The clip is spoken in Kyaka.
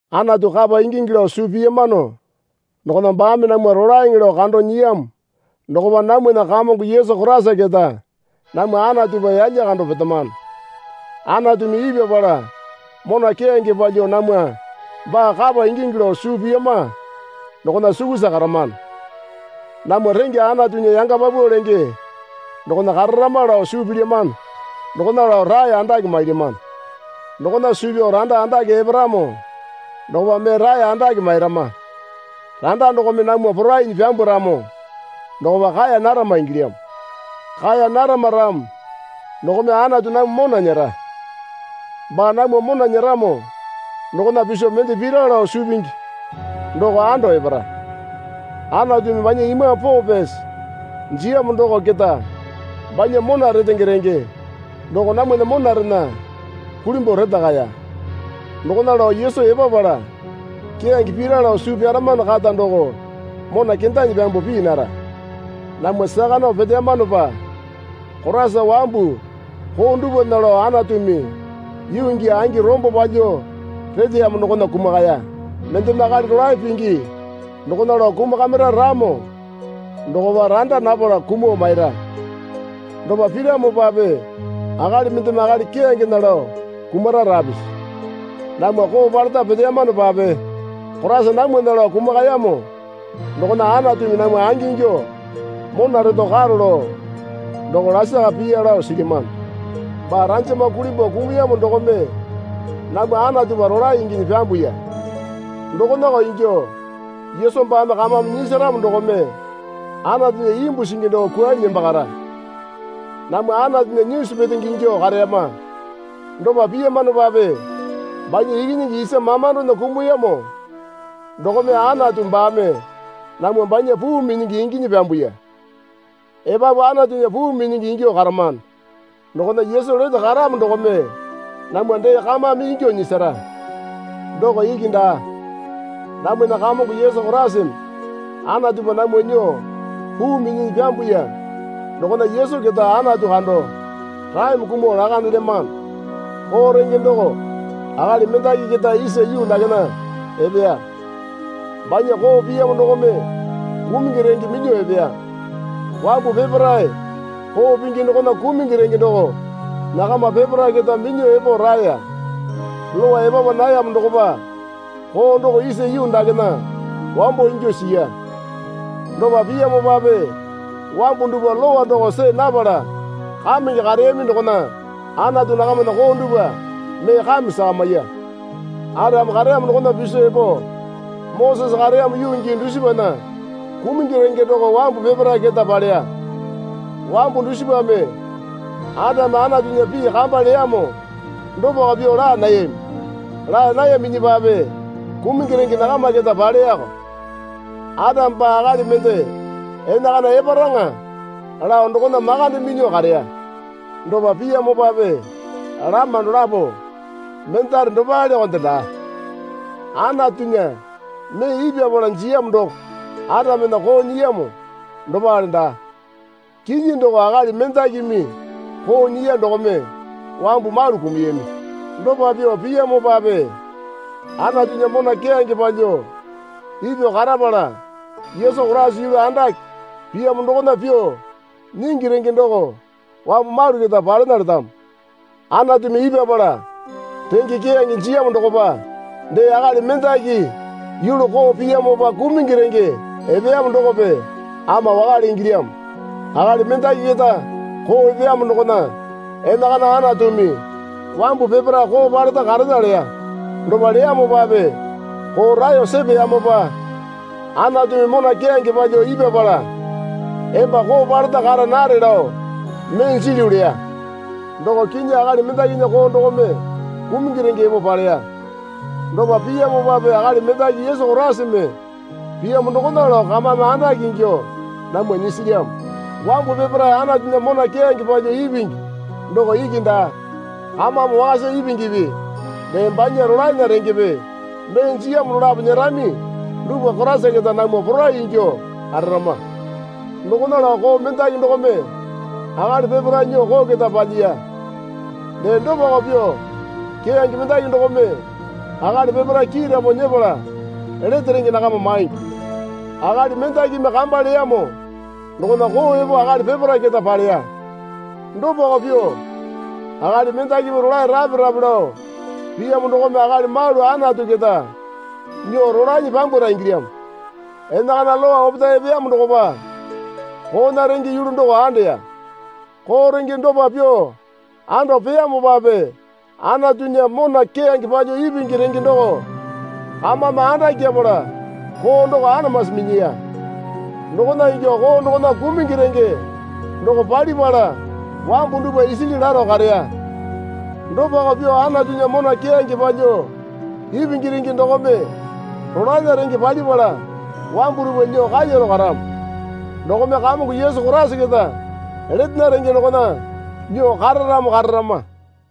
Anatu kapa ingingi lao suu piyamano dokona baame namwa rolaeŋe lao kando nyiyamo dokopa namwana Kamongo Yesu Koraisa keta namwa Anatupa yalya kando petamano. Anatumi ipyapala mona keyange palyuo namwa baa kapa ingingi lao suu piyama dokona sukusa karamano. Namwa rengya Anatunya yanga paupau lenge dokona kararama lao suu pilyamano dokona lao rae andake mailyamano. Dokona suu pyao randa andake eparamo dokopa mee rae andake mairama. Randa dokome namwa porainyi pyambwaramo dokopa kaeya narama ingilyamo. Kaeya narama ramo dokome Anatu namwa mona nyera. Baa namwa mona nyeramo dokona piso mende pira lao suu pingi doko ando epara. Anatumi banya Imambu Poo Pyasi jiyamo doko keta banya mona retenge renge doko namwana monarena kulimbuo retakaya. Dokona lao Yesu epapala keyange pira lao suu pyaramano kata doko mona kendanyi pyambuo pii nara. Namwa saka nao peteyamanopa Koraisa wambu koo dupwana lao Anatumi yuu gii angi rombo palyuo reteyamo dokona kumakaya. Mendeme akali rolae pingi dokona lao kumakamira ramo dokopa randa napala kumuo maira. Dopa piramopape akali mendeme akali keyangena lao kumara rapisi. Namwa koo paleta peteyamanopape Koraisa namwana lao kumakayamo dokona Anatumi namwa angingyuo mona reto karo lao doko lasaka piya lao silyamano. Baa ranjama kulimbuo kumuyamo dokome namwa Anatupa rolae inginyi pyambuya. Dokonako ingyuo Yesu baame kamame nyisaramo dokome Anatunya imbu singi doko kwuanyi nembakara. Namwa Anatunya nyisu petenge ingyuo kareyama. Dopa piyamanopape banya Ikinyingi isa mamandona kumuyamo dokome Anatu baame namwa banya puu minyingi inginyi pyambuya. Epapu Anatunya puu minyingi ingyuo karamano dokona Yesu lete karamo dokome namwa dee kamame ingyuo nyisara. Doko iki daa. Namwana Kamongo Yesu Koraisame Anatupa namwa nyuo puu minyinyi pyambuya dokona Yesu keta Anatu kando raeme kumuo lakandelyamano. Koo renge doko akali mendaki keta isa yuu dakena epeya. Banya koo piyamo dokome kumungi renge minyuo epeya. Wambu peparae koo pingi dokona kumungi renge doko nakama peparae keta minyuo epo raeya. Lowa epapa nayamo dokopa koo doko isa yuu dakena wambo ingyuo siya. Dopa piyamopape wambu dupwa lowa doko see napala kamenge kareyami dokona Anatu nakamana koo dupwa mee kame sakamiya. Atame kareyamo dokona piso epo Mosese kareyamo yuu gii dusipana kumungi renge doko wambu peparae keta paleya. Wambu dusipame Atame Anatunya pii kamba leyamo dopako pyuo laa nayami. Laa nayaminyipape kumungi renge nakama keta paleyako. Atame baa akali mende enakana eparaŋa lao dokona makande minyuo kareya. Dopa piyamopape lama dolapo mendare dopalekonde daa. Anatunya mee ipyapala jiyamo doko Atamena koo nyiyamo dopale daa. Kinyi doko akali mendakimi koo nyiya dokome wambu malu kumuyami. Dopa pyuo piyamopape Anatunya mona keyange palyuo ipyuo karapala Yesu Koraisa yulu andake piyamo dokona pyuo nyingi renge doko wambu malu keta palena letamo. Anatumi ipyapala renge keyange jiyamo dokopa dee akali mendaki yulu koo piyamopa kumungi renge epeyamo dokope ama wakale ingilyamo. Akali mendaki keta koo epeyamo dokona enakana Anatumi wambu peparae koo paleta karena leya. Dopa leyamopape koo raeyo sepeyamopa Anatumi mona keyange palyuo ipyapala emba koo paleta kara nare lao mee jilyu leya. Doko kinyi akali mendakinya koo dokome kumungi renge epo paleya. Dopa piyamopape akali mendaki Yesu Koraisame piyamo dokona lao kamame andake ingyuo namwa nyisilyamo. Wambu peparae Anatunya mona keyange palyuo ipingi doko iki daa, kamame wakasa ipingipi dee banya rolaena rengepe mee jiyamo dolapo nyerami dupwa Koraisa keta namwa poraiyuo ingyuo kararama. Dokona lao koo mendaki dokome akali peparae nyuo koo keta palyiya. Dee dopako pyuo keyange mendaki dokome akali peparae kiiramo nyepala lete renge nakama maingi. Akali mendakimi kamba leyamo dokona koo epo akali peparae keta paleya. Dopako pyuo akali mendakimi rolae rape rape lao piyamo dokome akali malu Anatu keta nyuo rolanyi pyambwara ingilyamo. Enakana Lowa opetae epeyamo dokopa koona renge yulu doko andeya. Koo renge dopa pyuo ando peyamopape Anatunya mona keyange palyuo ipingi renge doko kamame andakyapala koo doko anamasi minyiya. Dokona ingyuo koo dokona kumungi renge doko palipala wambu dupwa isili laro kareya. Dopako pyuo Anatunya mona keyange palyuo ipingi renge dokome rolaena renge palipala wambu dupwa nyuo kalyaro karamo. Dokome Kamongo Yesu Koraisa keta letena renge dokona nyuo kararamo kararama.